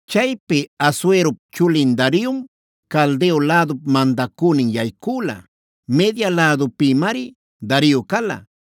Chaypi Asuerop chulin Dariom Caldeo lädupa mandacünin yaycüla; Media lädupïmari Dario cala.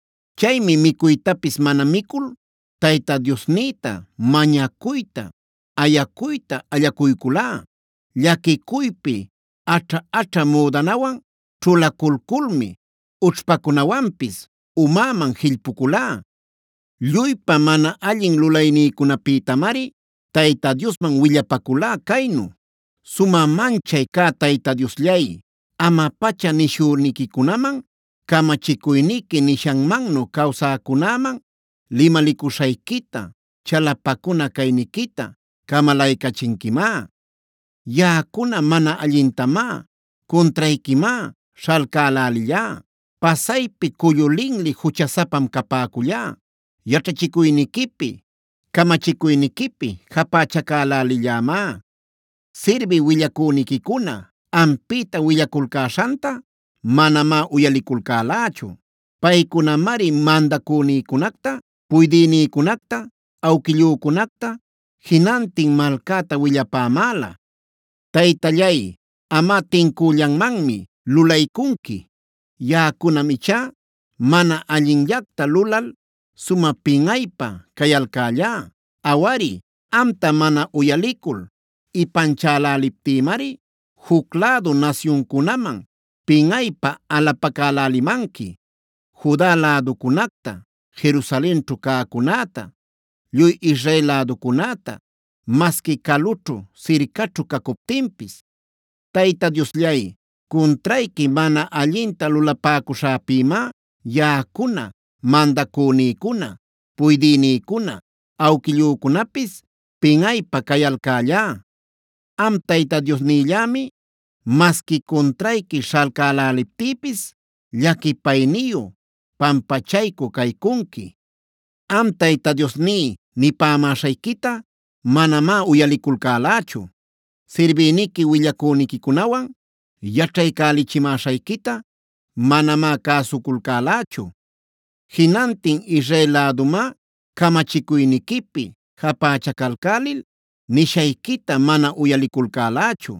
Chaymi micuytapis mana micul Tayta Diosnïta mañacuyta, ayacuyta allacuyculá. Llaquicuypi aćha-aćha müdanawan ćhulaculculmi ućhpacunawanpis umäman jillpuculá. Lluypa mana allin lulaynïcunapïtamari Tayta Diosman willapaculá caynu: “Sumä manchay cä Tayta Diosllay, ama-pacha nishüniquicunaman, camachicuyniqui nishanmannu cawsäcunäman limalicuśhayquita, chalapacuna cayniquita camalaycachinquimá. Yaꞌacuna mana allintamá, cuntrayquimá śhalcälälillá. Pasaypi cullu linli juchasapam capäcullá. Yaćhachicuyniquipi, camachicuyniquipi japächacälälillämá. Sirbï willacüniquicuna ampïta willaculcäśhanta manamá uyaliculcälächu. Paycunamari mandacünïcunacta, puydïnïcunacta, awquillücunacta, jinantin malcäta willapämäla. Taytallay, amꞌa tincüllanmanmi lulaycunqui. Yaꞌacunam ichá mana allinllacta lulal sumä pinꞌaypä cayalcällá. Awari, amta mana uyalicul ipanchäläliptïmari juc lädu nasyuncunaman pinꞌaypä alapacälälimanqui: Juda läducunacta, Jerusalenćhu cäcunäta, lluy Israel läducunäta, masqui calućhu-sircaćhu cacuptinpis. Tayta Diosllay, cuntrayqui mana allinta lulapäcuśhäpïmá yaꞌacuna, mandacünïcuna, puydïnïcuna, awquillücunapis pinꞌaypä cayalcällá. Am Tayta Diosnillämi masqui cuntrayqui śhalcäläliptïpis llaquipayniyu, pampachaycü caycunqui. Am Tayta Diosní nipämäśhayquita manamá uyaliculcälächu. Sirbïniqui willacüniquicunawan yaćhaycälichimäśhayquita manamá cäsuculcälächu. Jinantin Israel lädumá camachicuyniquipi japächacalcälil nishayquita mana uyaliculcälächu.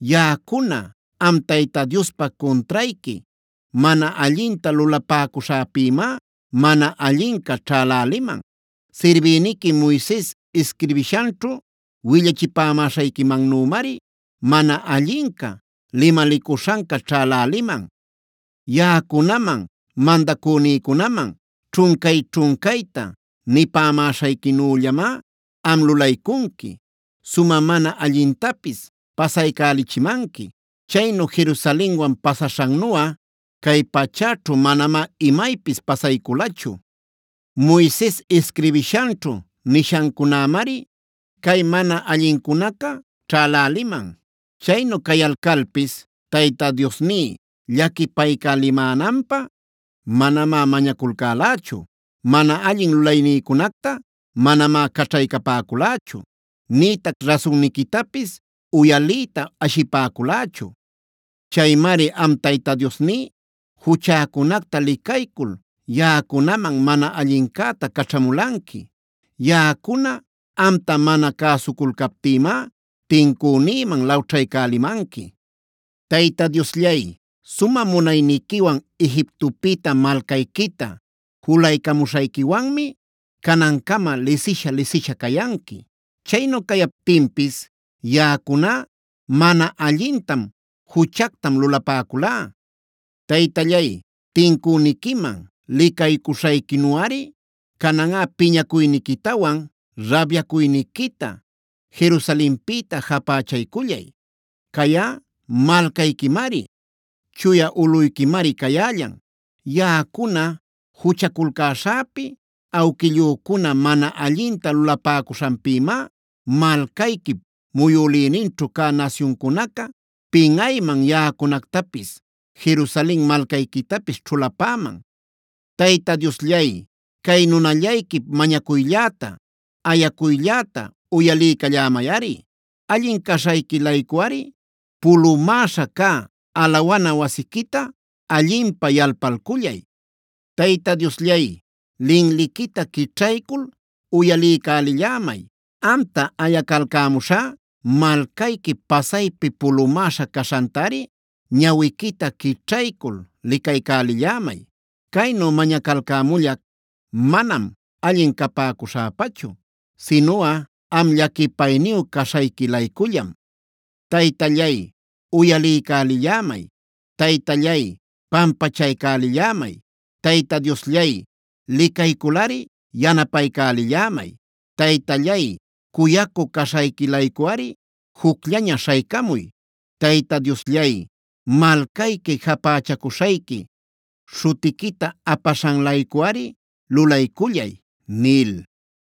Yaꞌacuna am Tayta Diospa cuntrayqui mana allinta lulapäcuśhäpïmá mana allinca ćhäläliman. Sirbïniqui Moises isquirbishanćhu willachipämäśhayquimannümari mana allinca, limalicuśhanca ćhäläliman. Yaꞌacunaman, mandacünïcunaman ćhuncay-ćhuncayta nipämäśhayquinüllamá am lulaycunqui, sumä mana allintapis pasaycälichimanqui. Chaynu Jerusalenwan pasaśhannuꞌa cay pachäćhu manamá imaypis pasayculachu. Moises isquirbishanćhu nishancunämari cay mana allincunaca ćhäläliman. Chaynu cayalcalpis Tayta Diosní llaquipaycälimänanpä manamá mañaculcälächu. Mana allin lulaynïcunacta manamá caćhaycapäculächu; nïtac rasunniquitapis uyaliyta ashipäculächu. Chaymari am Tayta Diosní, juchäcunacta licaycul yaꞌacunaman mana allincäta caćhamulanqui. Yaꞌacuna amta mana cäsuculcaptïmá tincünïman lawćhaycälimanqui. Tayta Diosllay, sumä munayniquiwan Egiptopïta malcayquita julaycamuśhayquiwanmi canancama lisisha-lisisha cayanqui. Chaynu cayaptinpis yaꞌacuná mana allintam, juchactam lulapäculá. Taytallay, tincüniquiman licaycuśhayquinuꞌari cananꞌa piñacuyniquitawan rabyacuyniquita Jerusalenpïta japächaycullay. Cayꞌa malcayquimari, chuya ulꞌuyquimari cayällan. Yaꞌacuna juchaculcäśhäpi, awquillücuna mana allinta lulapäcuśhanpïmá malcayquip muyülïninćhu cä nasyuncunaca pinꞌayman yaꞌacunactapis Jerusalen malcayquitapis ćhulapäman. Tayta Diosllay, cay nunallayquip mañacuylläta, ayacuylläta uyaliycallämayꞌari. Allin caśhayqui-laycuꞌari pulumäśha cä alawana wasiquita allinpä yalpalcullay. Tayta Diosllay, linliquita quićhaycul uyaliycälillämay. Amta ayacalcämuśhá malcayqui pasaypi pulumäśha caśhantari ñawiquita quićhaycul licaycälillämay. Caynu mañacalcämullac manam allin capäcuśhäpachu, sinuꞌa am llaquipayniyu caśhayqui-laycullam. Taytallay, uyaliycälillämay. Taytallay, pampachaycälillämay. Tayta Diosllay, licayculꞌari yanapaycälillämay. Taytallay, cuyacü caśhayqui-laycuꞌari jucllaña śhaycamuy. Tayta Diosllay, malcayqui japächacuśhayqui śhutiquita apaśhan-laycuꞌari lulaycullay” nil.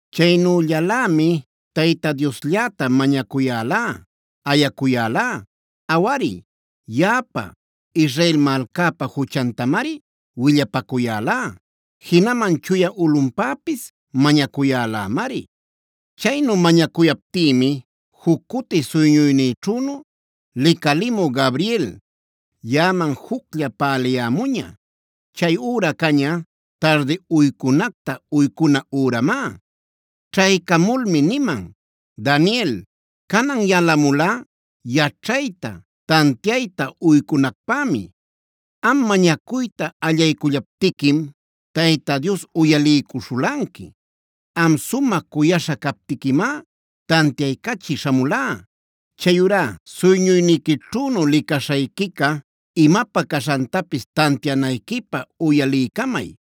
Chaynüllalämi Tayta Dioslläta mañacuyälá, ayacuyälá. Awari yaꞌapa, Israel malcäpa juchantamari willapacuyälá. Jinaman chuya ulꞌunpäpis mañacuyälämari. Chaynu mañacuyaptïmi juc cuti suyñuynïćhünu licalimü Gabriel, yaꞌaman juclla päliyämuña. Chay üra caña, tardi uycunacta uycuna üramá. Ćhaycamulmi niman: “Daniel, canan yalamulá yaćhayta, tantiayta uycunacpämi. Am mañacuyta allaycullaptiquim Tayta Dios uyaliycuśhulanqui. Am sumä cuyaśha captiquimá tantiaycachï śhamulá. Chayurá suyñuyniquićhünu licaśhayquica imapä caśhantapis tantianayquipä uyaliycamay.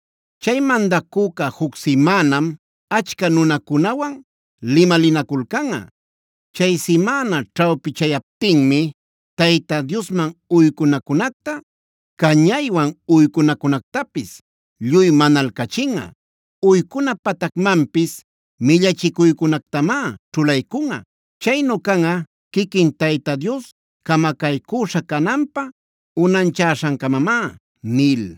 “Chay mandacüca juc simänam achca nunacunawan limalinaculcanꞌa. Chay simäna ćhawpichayaptinmi Tayta Diosman uycunacunacta, cañaywan uycunacunactapis lluy manalcachinꞌa. Uycuna patacmanpis millachicuycunactamá ćhulaycunꞌa.c Chaynu canꞌa quiquin Tayta Dios camacaycüśha cananpä unanchaśhancamamá” nil.